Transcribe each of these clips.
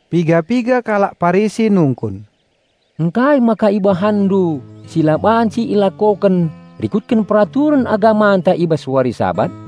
Piga-piga kalak Parisi nungkun, "Ngkai maka ibahanndu si la banci ilakoken rikutken peraturen agamanta i bas wari Sabat?"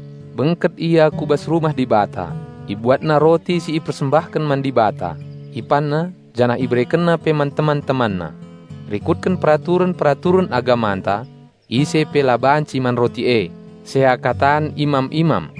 Bengket ia ku bas rumah Dibata, ibuatna roti si ipersembahken man Dibata, ipanna janah iberekenna pe man teman-temanna. Rikutken peraturen-peraturen agamanta ise pe la banci man roti e, seakatan imam-imam."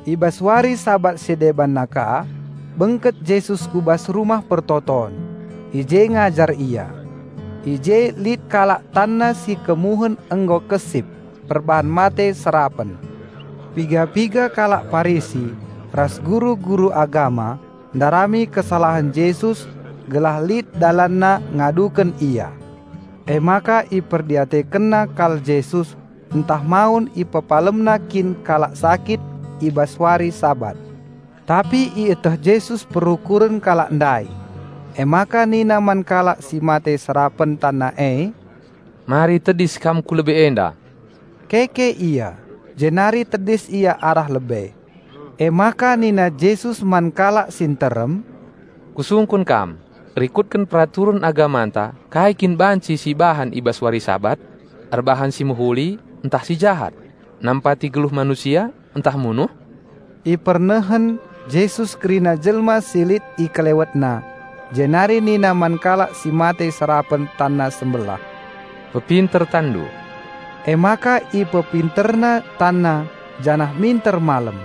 I bas wari Sabat si debanna ka bengket Jesus ku bas rumah persembahen, i je ngajar Ia. I je lit kalak tanna si kemuhen nggo kesip perban mate serapen. Piga-piga kalak Parisi ras guru-guru agama ndarami kesalahen Jesus gelah lit dalanna ngaduken Ia. Emaka iperdiatekenna kal Jesus ntah mawen IpepalemNa kin kalak sakit i bas wari Sabat. Tapi ieteh Jesus perukuren kalak ndai, emaka nina man kalak si mate serapen tanna e, "Mari tedis kam ku lebe enda!" Keke ia, jenari tedis ia arah lebe. Emaka nina Jesus man kalak si nterem, "Kusungkun kam; rikutken peraturen agamanta kai kin banci si bahan i bas wari Sabat? Erbahan si mehuli ntah si jahat? Nampati geluh manusia ntah munuh?" Ipernehen Jesus kerina jelma si lit IkelewetNa jenari nina man kalak si mate serapen tanna sembelah, "Pepinter tanndu." Emaka ipepinterna tanna janah minter malem.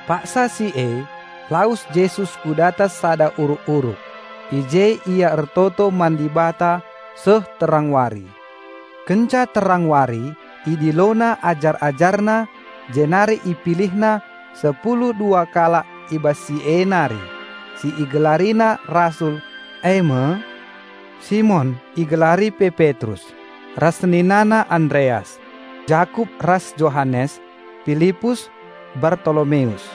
Paksa si e, lawes Jesus ku datas sada uruk-uruk; i je Ia ertoto man Dibata seh terang wari. Kenca terang wari, IdiloNa ajar-AjarNa, jenari IpilihNa sepulu dua kalak i bas si e nari, si IgelariNa rasul, e me: Simon (igelari pe Petrus) ras seninana Andreas; Jakup ras Johanes, Pilipus, Bartolomeus,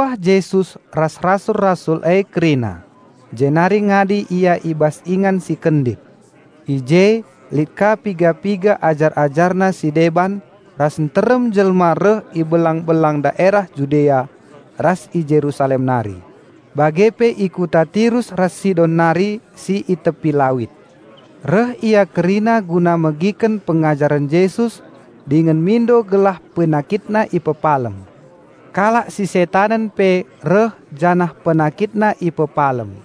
Ngincuah Jesus ras rasul-rasul e kerina, jenari ngadi Ia i bas ingan si kendit. I je lit ka piga-piga ajar-AjarNa si deban ras nterem jelma reh i belang-belang daerah Judea ras i Jerusalem nari, bage pe i Kota Tirus ras Sidon nari si i tepi lawit. Reh ia kerina guna megiken pengajaren Jesus dingen mindo gelah penakitna ipepalem. Kalak si setanen pe reh janah penakitna ipepalem.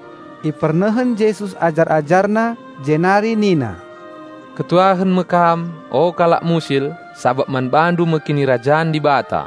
Kenca bage, ipernehen Jesus ajar-AjarNa, jenari nina, "Malem tuhu-tuhu atendu kam kalak musil-musil, sabap kam empuna Kinirajan Dibata.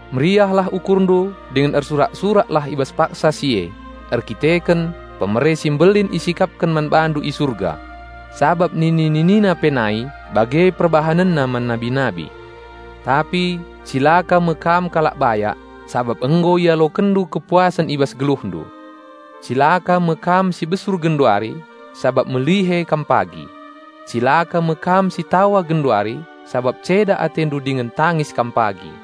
Meriahlah ukurndu dingen ersurak-suraklah i bas paksa si e, erkiteken hadiah si mbelin isikapken man bandu i Surga. Sabap nini-ninina pe nai bage perbahanenna man nabi-nabi. Tapi, cilaka me kam kalak bayak, sabap nggo ialokenndu kepuasen i bas geluhndu. Cilaka me kam si besur genduari; sabap melihe kam pagi! Cilaka me kam si tawa genduari; sabap ceda atendu dingen tangis kam pagi!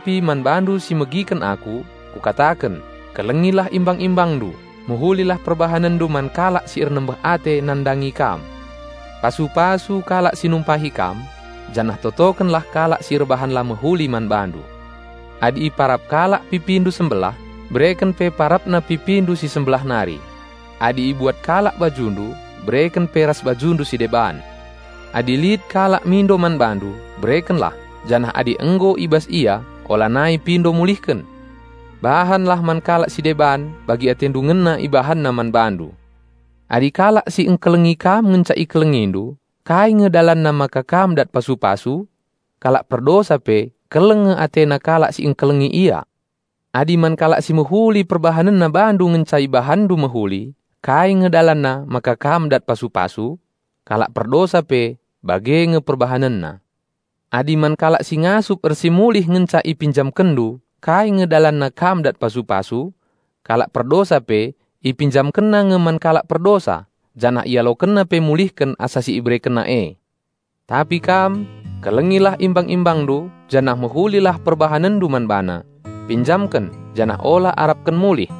"Tapi man bandu si megiken Aku, Kukataken, Kelengilah imbang-imbangndu, mehulilah perbahanenndu man kalak si ernembeh ate nandangi kam, pasu-pasu kalak si numpahi kam, janah totokenlah kalak si erbahan la mehuli man bandu. Adi iparap kalak pipindu sembelah, bereken pe parapna pipindu si sembelah nari. Adi ibuat kalak bajundu, bereken pe ras bajundu si deban. Adi lit kalak mindo man bandu, berekenlah, janah adi nggo i bas ia olanai pindo mulihken. Bahanlah man kalak si deban bagi atendu ngena ibahanna man bandu. Adi kalak si engkelengi kam ngenca ikelengindu, kai nge dalanna maka kam dat pasu-pasu? Kalak perdosa pe keleng nge atena kalak si engkelengi ia. Adi man kalak si mehuli perbahanenna bandu ngenca ibahanndu mehuli kai nge dalanna maka kam dat pasu-pasu? Kalak perdosa pe bage nge perbahanenna. Adi man kalak si ngasup ersimulih ngenca ipinjamkenndu kai nge dalanna kam dat pasu-pasu? Kalak perdosa pe ipinjamkenna nge man kalak perdosa, janah ialokenna pe mulihken asa si iberekenna e. Tapi kam, kelengilah imbang-imbangndu janah mehulilah perbahanenndu man bana; pinjamken janah ola arapken mulih.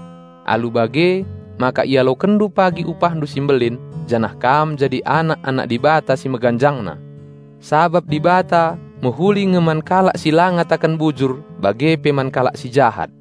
Alu bage maka ialokenndu pagi upahndu si mbelin janah kam jadi anak-anak Dibata si Meganjangna. Sabap Dibata mehuli nge man kalak si la ngataken bujur bage pe man kalak si jahat.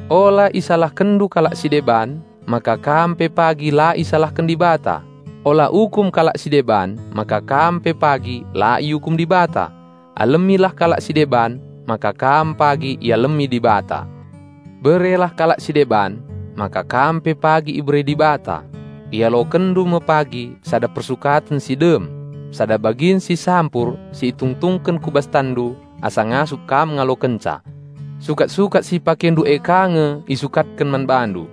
"Ola isalahkenndu kalak si deban, maka kam pe pagi la isalahken Dibata; ola ukum kalak si deban, maka kam pe pagi la iukum Dibata; alemilah kalak si deban, maka kam pagi ialemi Dibata. Berelah kalak si deban, maka kam pe pagi ibere Dibata; ialokenndu me pagi sada persukaten si dem, sada bagin si sampur si itungtungken ku bas tanndu asa ngasup kam ngalokenca. Sukat-sukat si ipakendu e ka nge isukatken man bandu."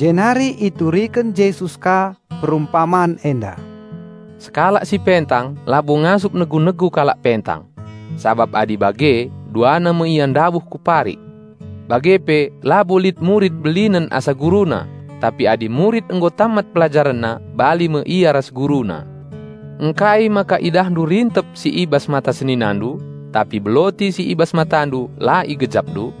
Jenari ituriken Jesus ka perumpaman enda, "Sekalak si pentang labo ngasup negu-negu kalak pentang; sabap adi bage duana me ia ndabuh ku parik. Bage pe labo lit murid belinen asa guruna; tapi adi murid nggo tammat pelajarenna, bali me ia ras guruna. Ngkai maka idahndu rintep si i bas mata seninandu, tapi beloti si i bas matandu la igejapndu?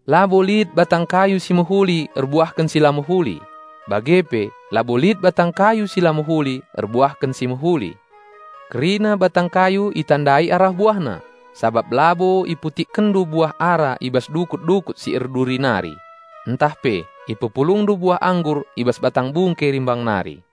"Labo lit batang kayu si mehuli erbuahken si la mehuli, bage pe labo lit batang kayu si la mehuli erbuahken si mehuli. Kerina batang kayu itandai arah buahna; sabap labo iputikkenndu buah ara i bas dukut-dukut si erduri nari, ntah pe ipepulungndu buah anggur i bas batang bungke rimbang nari.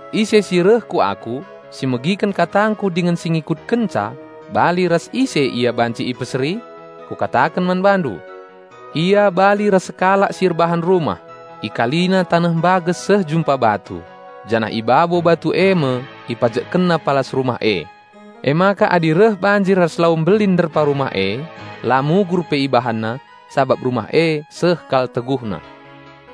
Ise si reh ku Aku, si megiken katangKu dingen si ngikutkenca -- bali ras ise ia banci ipeseri? -- Kukataken man bandu. Ia bali ras sekalak si erbahan rumah: Ikalina taneh mbages seh jumpa batu, janah i babo batu e me ipajekkenna palas rumah e. Emaka adi reh banjir ras lau mbelin nderpa rumah e, la mugur pe ibahanna, sabap rumah e seh kal teguhna.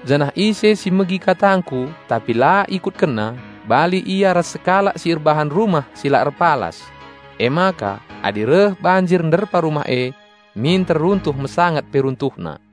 Janah ise si megi katangKu tapi la ikutkenna, bali ia ras sekalak si erbahan rumah si la erpalas; emaka adi reh banjir nderpa rumah e, minter runtuh mesangat pe runtuhna."